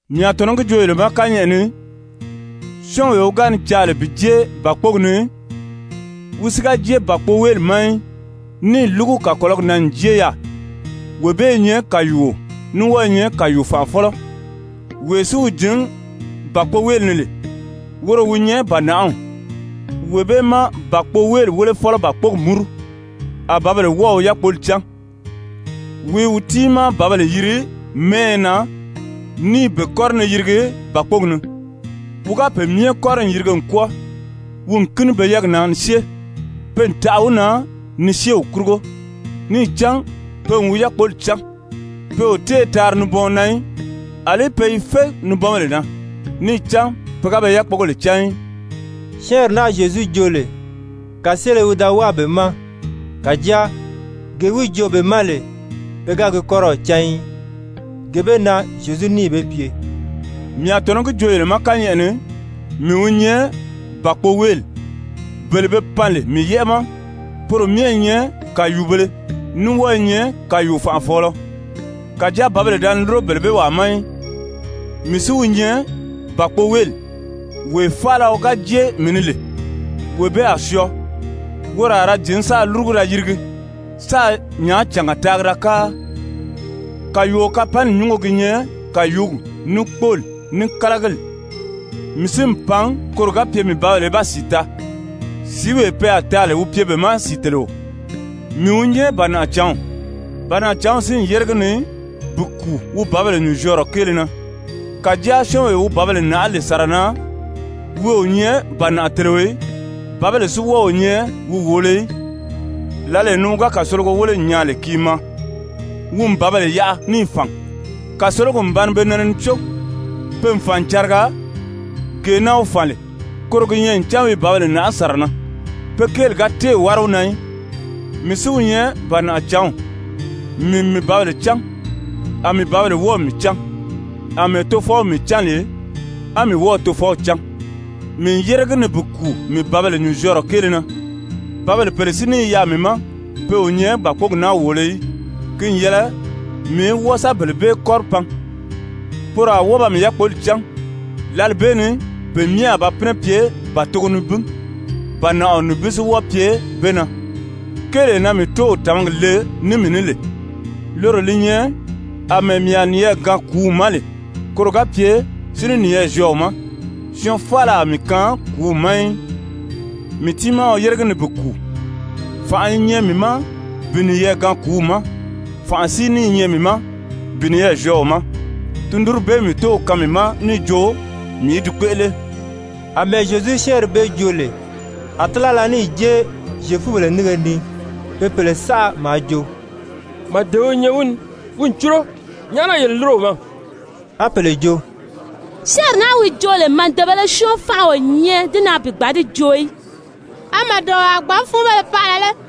«Mii a tɔ̀nɔ́ gi joo yele ma kányɛʔɛ ni, syɔ́ɔnwee wi ga ni caa lè bi jée bàkpogi ni, wi si ga jée bàkpoweeli ma í, níì lúgu kàkɔlɔgi na n jée yaà, wee bee i nyɛ kàyuuo ní wɔ́ɔ i nyɛ kàyuu-fànʔafɔlɔ. Wee si wi jǐn bàkpoweeli ni lè, woro wi nyɛ bànaʔaw. Wee bee má bàkpoweeli wélefɔlɔ bàkpogi múru, a bǎbèle wɔ́ɔ̀ wi yákpoli cán. Wi i wi tiimaa bǎbèle yiri mɛ́ɛyɛ na ní i be kɔ́ri ni yirigi bàkpogi ni. Wi ga pe myɛ kɔ́ri n yirige n kwɔ́ɔ, wi n kíni pe yɛ́ɛgi na ni syée. Pe n taʔa wi na ni syée wi kurugo, níì cán pe n wi yákpoli cán. Pe o téē taari nibɔɔn na í. Alí pe i fé nibɔnbèle na, níì cán pe ga be yákpogèle cán í.» Syɛ́ɛnri naa Zyezu joo lè, kàseele wi da wáa be ma. Kàjáa gee wi joo be ma lè, pe ga gi kɔ́rɔw cán í. Gee bee na Zyezu níì be pye: «Mii a tɔ̀nɔ́ gi joo yele ma kányɛʔɛ ni, mii wi nyɛ bàkpoweeli. Bele be pan lè mii yɛ́ʔɛ na, poro myɛ i nyɛ kàyuubēle, ní wɔ́ɔ i nyɛ kàyuu-fànʔafɔɔlɔ. Kàjáa bǎbèle da ni lúro bele bee wàa ma í. Mii si wi nyɛ bàkpoweeli. Wee faala wi ga jée mii ni lè, wee bee a syɔɔ. Woro a ra jǐn sáā lúrugu da yirigi, sáā nyàácànga taagi da káa. Kàyuuo kapanni nyúngo gi nyɛ kàyuugi, ní kpóoli, ní kálagili. Mii si n pan koro ga pye mii bǎbèle í ba sìi taa, sìíwee pe a taa lè wi pye be ma sìiteleo. Mii wi nyɛ bànaʔacǎnw. Bànaʔacǎnw si n yére gi ni bi kùu wi bǎbèle nyùnzyɔɔrɔ kéele na. Kàjáa syɔ́ɔnwee wi bǎbèle nàʔá lè sàra na, wi o nyɛ bànaʔateleo í, bǎbèle si wɔ́ɔ o nyɛ wi wòolo í, lǎlee ni wi ga kàsologo wéle n nyaa lè ki i maa, wi n bǎbèle yaʔa níì fàn. Kàsologi n ba ni be nɛnɛ ni có, pe n fàn n cariga. Gee na wi fàn lè, koro gi nyɛ ncan wi i bǎbèle nàʔá sàra na. Pe kéeli ga téè wári wi na í. Mii si wi nyɛ bànaʔacǎnw. Mii n mii bǎbèle cán, a mii bǎbèle wɔ́ɔ̀ mii cán, àmɛɛ Tofɔw mii cán lè á mii wɔ́ɔ̀ Tofɔw cán. Mii n yére gi ni bi kùu mii bǎbèle nyùnzyɔɔrɔ kéele na. Bǎbèle pèle si ní i yaà mii ma, pe o nyɛ bàkpogi naa wòolo í. Ki n yɛlɛ mii í wɔ́ɔ sa bele bee kɔ́ri pan. Poro a wɔ́ɔ ba mii yákpoli cán, lǎli bee ni pe myɛ a ba pínɛ pye bàtogo nibin, bànaʔaɔ nibin si wɔ́ɔ pye be na. Kéelee na mii Tóow tàmagi le ní mii ní lè, loro li nyɛ àmɛɛ mii a niyɛɛ gaan kùúw ma lè, koro ga pye si ní niyɛɛ zyɔɔ wi ma. Syɔɔn faala a mii kaan kùúw ma í, mii tiimaa wi yére gi ni bi kùu. Fànʔa i nyɛ mii ma bi niyɛɛ gaan kùúw ma, fànʔa si ní i nyɛ mii ma bi niyɛɛ zyɔɔ wi ma. Tundunri bee mii Tóow kaan mii ma níì jo mii í di kpéʔele.» Amɛɛ Zyezu syɛ́ɛnri bee joo lè, a tílala níì jée Zyefubèle nínge ni. Pe pèle saʔa maa jo: «Màdeo i nyɛ wi ni, wi n cúro. Nyàʔá na yele lúro wi ma?» A pèle jo: «Syɛ́ɛnri naa wi joo lè, màdebēle syɔ́ɔn fánʔa o nyɛ di na bi gbǎn di joo í. A màdeo a gbǎn fúunbéle paʔala lé?»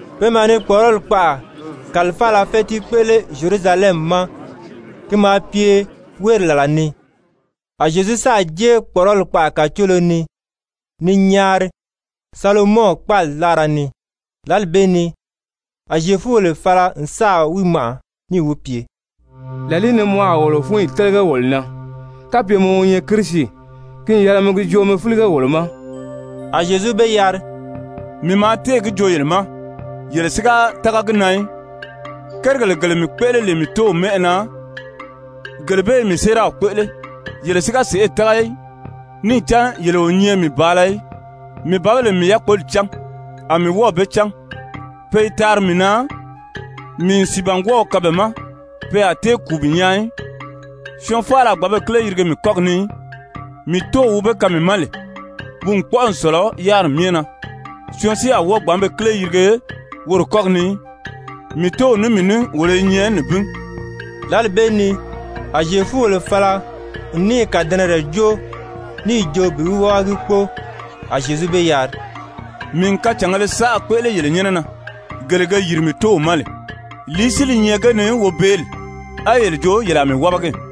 Pe maa ni kpɔ̀ʔɔrɔli kpaʔa kàlifaala fɛ́tii kpéʔele Zyerusalɛmi ma ki maa pye wéeri làla ni. A Zyezu sáà jée kpɔ̀ʔɔrɔli kpaʔa kàcoolo ni, ni nyaari Salomɔn kpáali láara ni. Lǎli bee ni a Zyefubèle fala n sáà wi màʔa, níì wi pye: «Làlìí ni mɔ a wolo fúnyi télege wolo na? Kapye mɔ wi nyɛ Kirisi, ki n yɛlɛ mi gi joo mi fílige wolo ma.» A Zyezu be yari: «Mii maa téè gi joo yele ma, yele si ga tága gi na í. Kérigèle gele mii kpéʔele lè mii Tóow mɛ́ʔɛ na, gele bee i mii séeraw kpéʔele. Yele si ga sèʔê tága í, níì cán yele o nyɛ mii bàala í. Mii bǎbèle n mii yákpoli cán, a mii wɔ́ɔ̀ be cán. Pe i taari mii na. Mii n sìibangwɔɔw kaan be ma. Pe a tée kùu bi nyaa í. Syɔɔn faala a gbǎn be kíle yirige mii kɔ́gi ni í. Mii Tóow wi be kaan mii ma lè, wi n kpɔ́ʔɔ n sɔ̀lɔ yáriri myɛ na. Syɔɔn si a wɔ́ɔ gbǎn be kíle yirige woro kɔ́gi ni í. Mii Tóow ní mii ní wolo i nyɛ nibin.» Lǎli bee ni a Zyefubèle fala n níì kàdɛnɛrɛ jóo níì jo bi wi wábagi kpóo. A Zyezu be yari: «Mii n kacàngēle saʔa kpéʔele yele nyɛ́nɛ na, gele ge yìri mii Tóow ma lè. Lìí si li nyɛ ge ni wobeeli, á ye jo ye a mii wábagi?»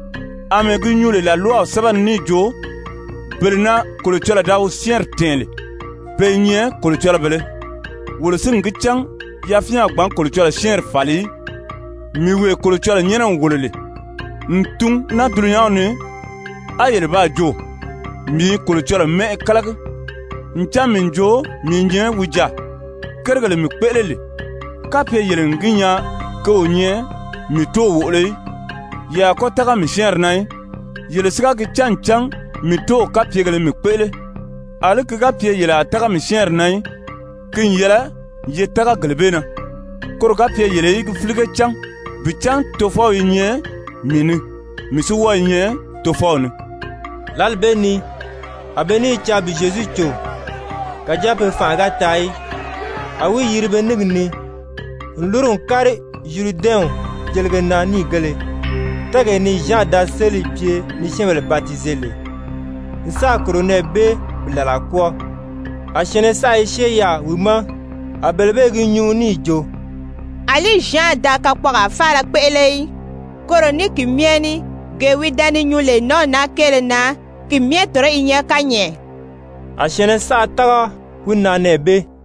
Amɛɛ gi nyuu lè làlwaw sɛ́bɛ ni níì jo, bele na Kolocɔlɔɔ da wi syɛ́ɛnri tɛ̀ɛn lè, pe i nyɛ kolocɔlɔbèlē (wolo si n gi cán yafyɛn a gbǎn Kolocɔlɔɔ syɛ́ɛnri fàli í), mii wee Kolocɔlɔɔ nyɛ́nɛ n wòlo lè n tun naa dulunyanw ni, a yele baa jo, mii i Kolocɔlɔɔ mɛ́ʔɛ kálagi, ncan mii n jo mii i nyɛ wi jaà! Kérigèle mii kpéʔele lè, kapye yele n gi nyaa ke o nyɛ mii Tóow wòʔolo í, ye a kɔ́ tága mii syɛ́ɛnri na í! Yele si ga gi cán ncan mii Tóow kapyegèlē mii kpéʔele, àlí ki ga pye yele a tága mii syɛ́ɛnri na í, ki n yɛlɛ ye tága gele bee na, koro ga pye yele í gi fílige cán bi cán Tofɔw i nyɛ mii ni, mii si wɔ́ɔ i nyɛ Tofɔw ni.» Lǎli bee ni a be ní i caa bi Zyezu cò, kàjáa pe fanʔa ga taa í, a wi yiri be níngi ni, n lúru n kári Zyuridɛnw jelige na níìgēle, tɛ́ɛgee ni Zyan da sélì pye ni syɛ́ɛnbèle batize lè, n sáà kòro nɛɛ bee bi làlaa kwɔ́ɔ. A syɛ̀ɛnnɛ saʔa i syée yaà wi ma. A bele bee i gi nyuu níì jo: «Alí Zyan da kakpɔɔgaa faala kpéʔele í. Koro ní ki myɛ ní, gee wi da ni nyuu lè nǎnw naa kéele na, ki myɛ tɔ̀nɔ́ i nyɛ kányɛʔɛ.» A syɛ̀ɛnnɛ saʔa tága wi na nɛɛ bee.